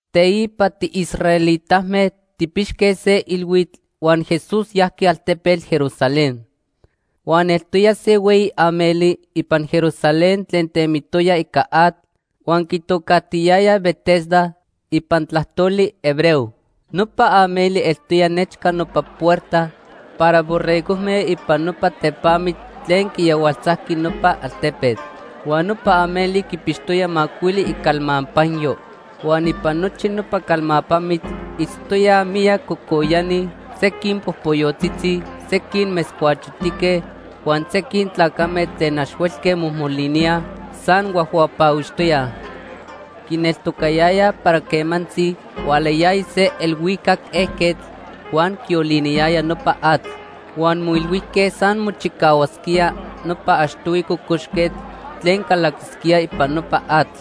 Teipa tiisraelitame tijpixque se ilhuitl huan Jesús yajqui altepetl Jerusalén. Huan eltoya se hueyi ameli ipan Jerusalén tlen temitoya ica atl huan quitocajtiyayaj Betesda ipan tlajtoli hebreo. Nopa ameli eltoya nechca nopa puerta para Borregojme ipan nopa tepamitl tlen quiyahualtzajqui nopa altepetl. Huan nopa ameli quipixtoya macuili icalmapanyo. Huan ipan nochi nopa calmapamitl itztoyaj miyac cocoyani; sequin popoyotzitzi, sequin metzcuachotique huan sequin tlacame tlen ax huelque mojmoliníaj, san huajhuapahuixtoyaj. Quineltocayayaj para quemantzi hualayaya se elhuicac ejquetl huan quioliniyaya nopa atl. Huan moilhuijque san mochicahuasquía nopa achtohui cocoxquetl tlen calaquisquía ipan nopa atl.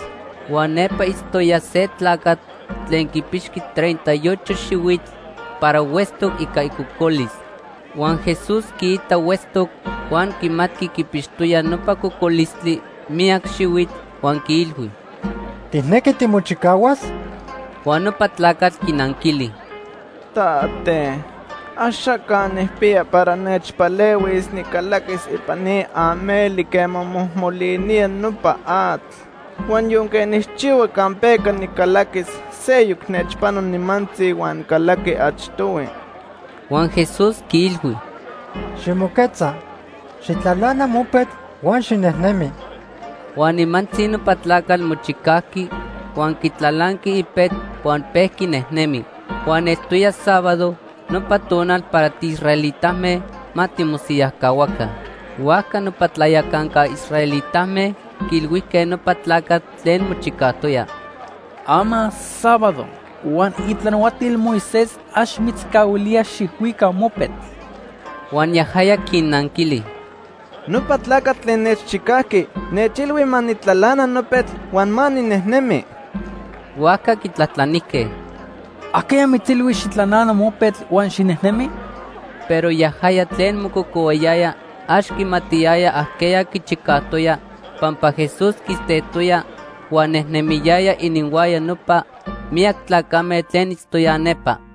Huan nepa itztoya se tlacatl tlen quipixqui treinta y ocho xihuitl para huetztoc ica icocolis. Huan Jesús quiitac huetztoc huan quimatqui quipixtoya nopa cocolistli miyac xihuitl, huan quiilhui: ―¿Tijnequi timochicahuas? Huan nopa tlacatl quinanquili: ―Tate, axaca nijpiya para nechpalehuis nicalaquis ipan ni ameli quema mojmolinía nopa atl. Huan yonque nijchihua campeca nicalaquis, seyoc nechpano nimantzi huan calaqui achtohui. Huan Jesús quiilhui: ―Ximoquetza, xijtlalana mopetl huan xinejnemi. Huan nimantzi nopa tlacatl mochicajqui, huan quitlalanqui ipetl huan pejqui nejnemi. Huan eltoya sábado, nopa tonal para tiisraelitame ma timosiyajcahuaca. Huajca nopa tlayacanca israelitame quiilhuijque nopa tlacatl tlen mochicajtoya: ―Ama sábado huan itlanahuatil Moisés ax mitzcahuilía xijhuica mopetl. Huan yajaya quinnanquili: ―Nopa tlacatl tlen nechchicajqui nechilhui ma nijtlalana nopetl huan ma ninejnemi. Huajca quitlajtlanijque: ―¿Ajqueya mitzilhui xijtlalana mopetl huan xinejnemi? Pero yajaya tlen mococohuayaya ax quimatiyaya ajqueya quichicajtoya pampa Jesús quistejtoya huan nejnemiyaya ininhuaya nopa miyac tlacame tlen itztoyaj nepa.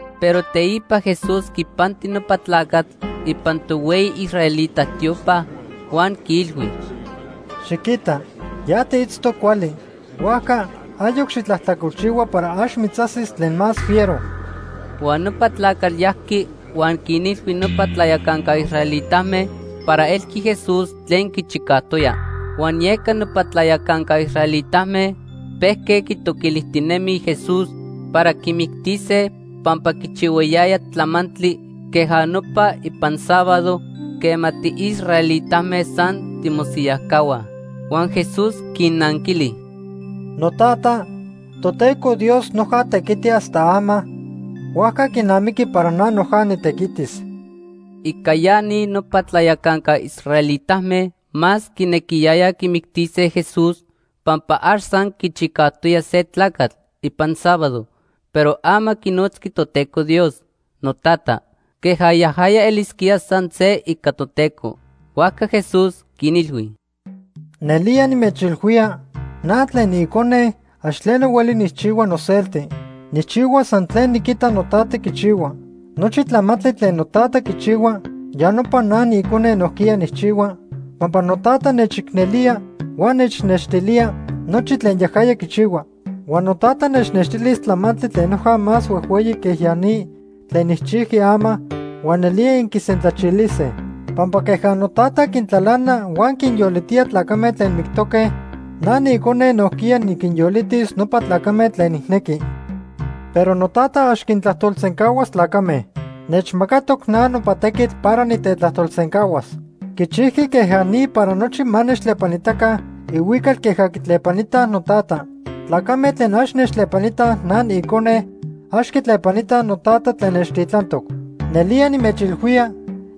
Pero teipa Jesús quipanti nopa tlacatl ipan tohueyi israelita tiopa huan quiilhui: ―Xiquita, ya tiitztoc cuali. Huajca ayoc xitlajtlacolchihua para ax mitzajsis tlen más fiero. Huan nopa tlacatl yajqui huan quinilhui nopa tlayacanca israelitame para elqui Jesús tlen quichicajtoya. Huan yeca nopa tlayacanca israelitame pejque quitoquilijtinemij Jesús para quimictise pampa quichihuayaya tlamantli queja nopa ipan sábado quema tiisraelitame san timosiyajcahuaj. Huan Jesús quinnanquili: ―NoTata, Toteco Dios noja tequiti hasta ama, huajca quinamiqui para na noja nitequitis. Ica ya ni nopa tlayacanca israelitame más quinequiyayaj quimictise Jesús, pampa ax san quichicajtoya se tlacatl ipan sábado, pero ama quinotzqui Toteco Dios: “NoTata”, queja yajaya elisquía san se ica Toteco. Huajca Jesús quinilhui: “Nelía nimechilhuía, na tlen niIcone ax tleno hueli nijchihua noselti. Nijchihua san tlen niquita noTata quichihua. Nochi tlamantli tlen noTata quichihua, ya nopa na niIcone nojquiya nijchihua, pampa noTata nechicnelía huan nechnextilía nochi tlen yajaya quichihua. Huan noTata nechnextilis tlamantli tlen noja más huejhueyi que ya ni tlen nijchijqui ama huan nelía inquisentlachilise. Pampa queja noTata quintlalana huan quinyolitía tlacame tlen mictoque, na niIcone nojquiya niquinyolitis nopa tlacame tlen nijnequi. Pero noTata ax quintlajtolsencahuas tlacame. Nechmacatoc na nopa tequitl para nitetlajtolsencahuas. Quichijqui queja ni para nochi ma nechtlepanitaca ihuical queja quitlepanitaj noTata. Tlacame tlen ax nechtlepanitaj na niIcone, ax quitlepanitaj noTata tlen nechtitlantoc. “Nelía nimechilhuía,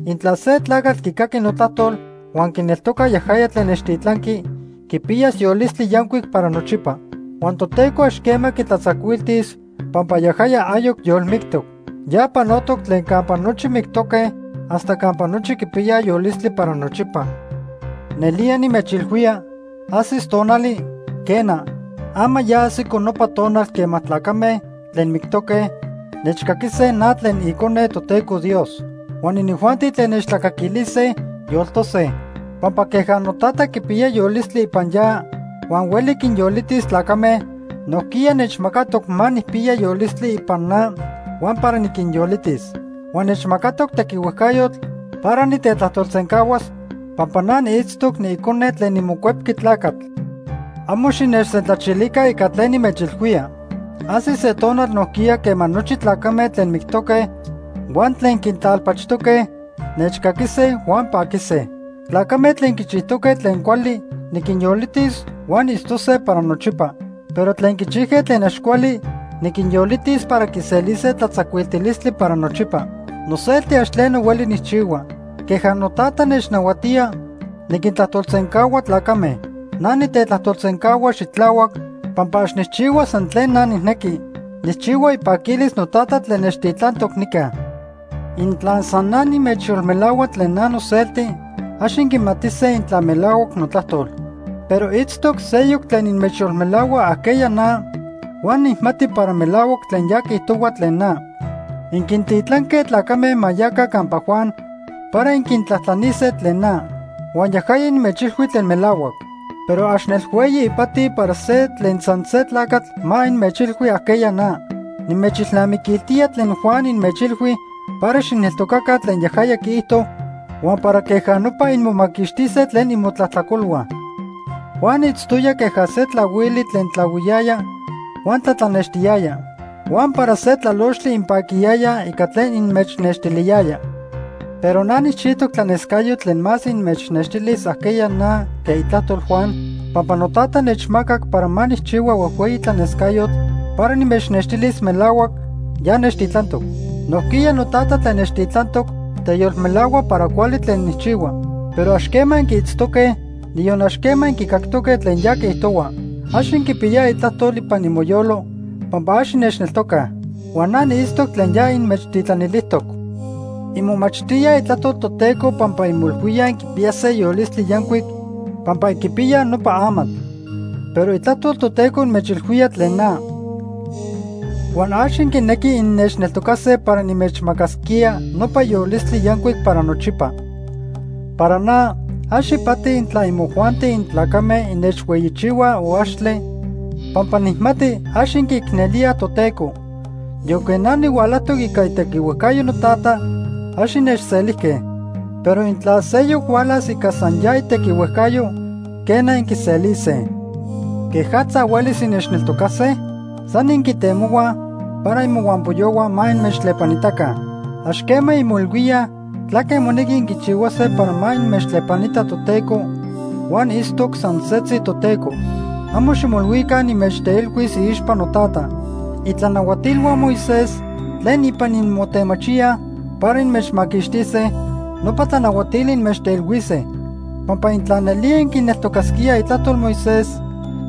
intla se tlacatl quicaqui notlajtol huan quineltoca yajaya tlen nechtitlanqui, quipiyas yolistli yancuic para nochipa. Huan Toteco ax quema quitlatzacuiltis pampa yajaya ayoc yolmictoc. Ya panotoc tlen campa nochi mictoque hasta campa nochi quipiyaj yolistli para nochipa. Nelía nimechilhuía, ajsis tonali, quena, ama ya ajsico nopa tonal quema tlacame tlen mictoque nechcaquise na tlen niIcone Toteco Dios. Huan inijuanti tlen nechtlacaquilise, yoltose. Pampa queja noTata quipiya yolistli ipan ya huan hueli quinyolitis tlacame, nojquiya nechmacatoc ma nijpiya yolistli ipan na huan para niquinyolitis. Huan nechmacatoc tequihuejcayotl para nitetlajtolsencahuas pampa na niitztoc niIcone tlen niMocuepqui Tlacatl. Amo xinechsentlachilica ica tlen nimechilhuía. Ajsis se tonal nojquiya quema nochi tlacame tlen mictoque huan tlen quintlalpachojtoque, nechcaquise huan panquisase. Tlacame tlen quichijtoque tlen cuali niquinyolitis huan itztose para nochipa, pero tlen quichijque tlen ax cuali niquinyolitis para quiselise tlatzacuiltilistli para nochipa. “Noselti ax tleno hueli nijchihua. Queja noTata nechnahuatía, niquintlajtolsencahua tlacame. Na nitetlajtolsencahua xitlahuac pampa ax nijchihua san tlen na nijnequi, nijchihua ipaquilis noTata tlen nechtitlantoc nica. Intla san na nimechyolmelahua tlen na noselti, ax inquimatise intla melahuac notlajtol. Pero itztoc seyoc tlen inmechyolmelahua ajqueya na huan nijmati para melahuac tlen ya quiijtohua tlen na. Inquintitlanque tlacame ma yaca campa Juan para inquitlajtlanise tlen na. Huan yajaya inmechilhui tlen melahuac. Pero ax nel hueyi ipati para se tlen san se tlacatl ma inmechilhui ajqueya na. Nimechilnamiquiltía tlen Juan inmechilhui para xijneltocaca tlen yajaya quiijto huan para queja nopa inmomaquixtise tlen imotlajtlacolhua. Juan itztoya queja se tlahuili tlen tlahuiyaya huan tlatlanextiyaya. Huan para se tlalochtli inpaquiyayaj ica tlen inmechnextiliyaya. Pero na nijchijtoc tlanescayotl tlen más inmechnextilis ajqueya na que itlajtol Juan, pampa noTata nechmacac para ma nijchihua huejhueyi tlanescayotl para nimechnextilis melahuac ya nechtitlantoc. Nojquiya noTata tlen nechtitlantoc teyolmelahua para cuali tlen nijchihua. Pero ax quema inquiitztoque, niyon ax quema inquicactoque tlen ya quiijtohua. Ax inquipiyaj itlajtol ipan imoyolo pampa ax innechneltocaj. Huan na niitztoc tlen ya inmechtitlanilijtoc. Inmomachtíaj Itlajtol Toteco pampa inmoilhuíaj inquipiyase yolistli yancuic pampa inquipiyaj nopa amatl. Pero Itlajtol Toteco inmechilhuía tlen na. Huan ax inquinequij innechneltocase para nimechmacasquía nopa yolistli yancuic para nochipa. “Para na, ax ipati intla imojuanti intlacame innechhueyichihuaj o axtle, pampa nijmati ax inquiicnelíaj Toteco. Yonque na nihualajtoc ica itequihuejcayo noTata, ax innechselijque. Pero intla seyoc hualas ica san ya itequihuejcayo, quena, inquiselise. ¿Quejatza huelis innechneltocase? San inquitemohuaj para imohuampoyohua ma inmechtlepanitaca. Ax quema inmoilhuíaj tlaque monequi inquichihuase para ma inmechtlepanita Toteco huan itztoc san setzi Toteco. Amo ximoilhuica nimechteilhuis iixpa noTata. Itlanahuatilhua Moisés tlen ipan inmotemachíaj para inmechmaquixtise, nopa tlanahuatili inmechteilhuise. Pampa intla nelía inquineltocasquíaj itlajtol Moisés,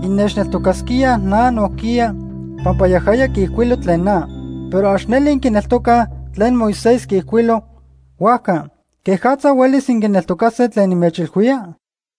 innechneltocasquíaj na nojquiya pampa yajaya quiijcuilo tlen na. Pero ax neli inquineltocaj tlen Moisés quiijcuilo, huajca ¿quejatza huelis inquineltocase tlen nimechilhuía?”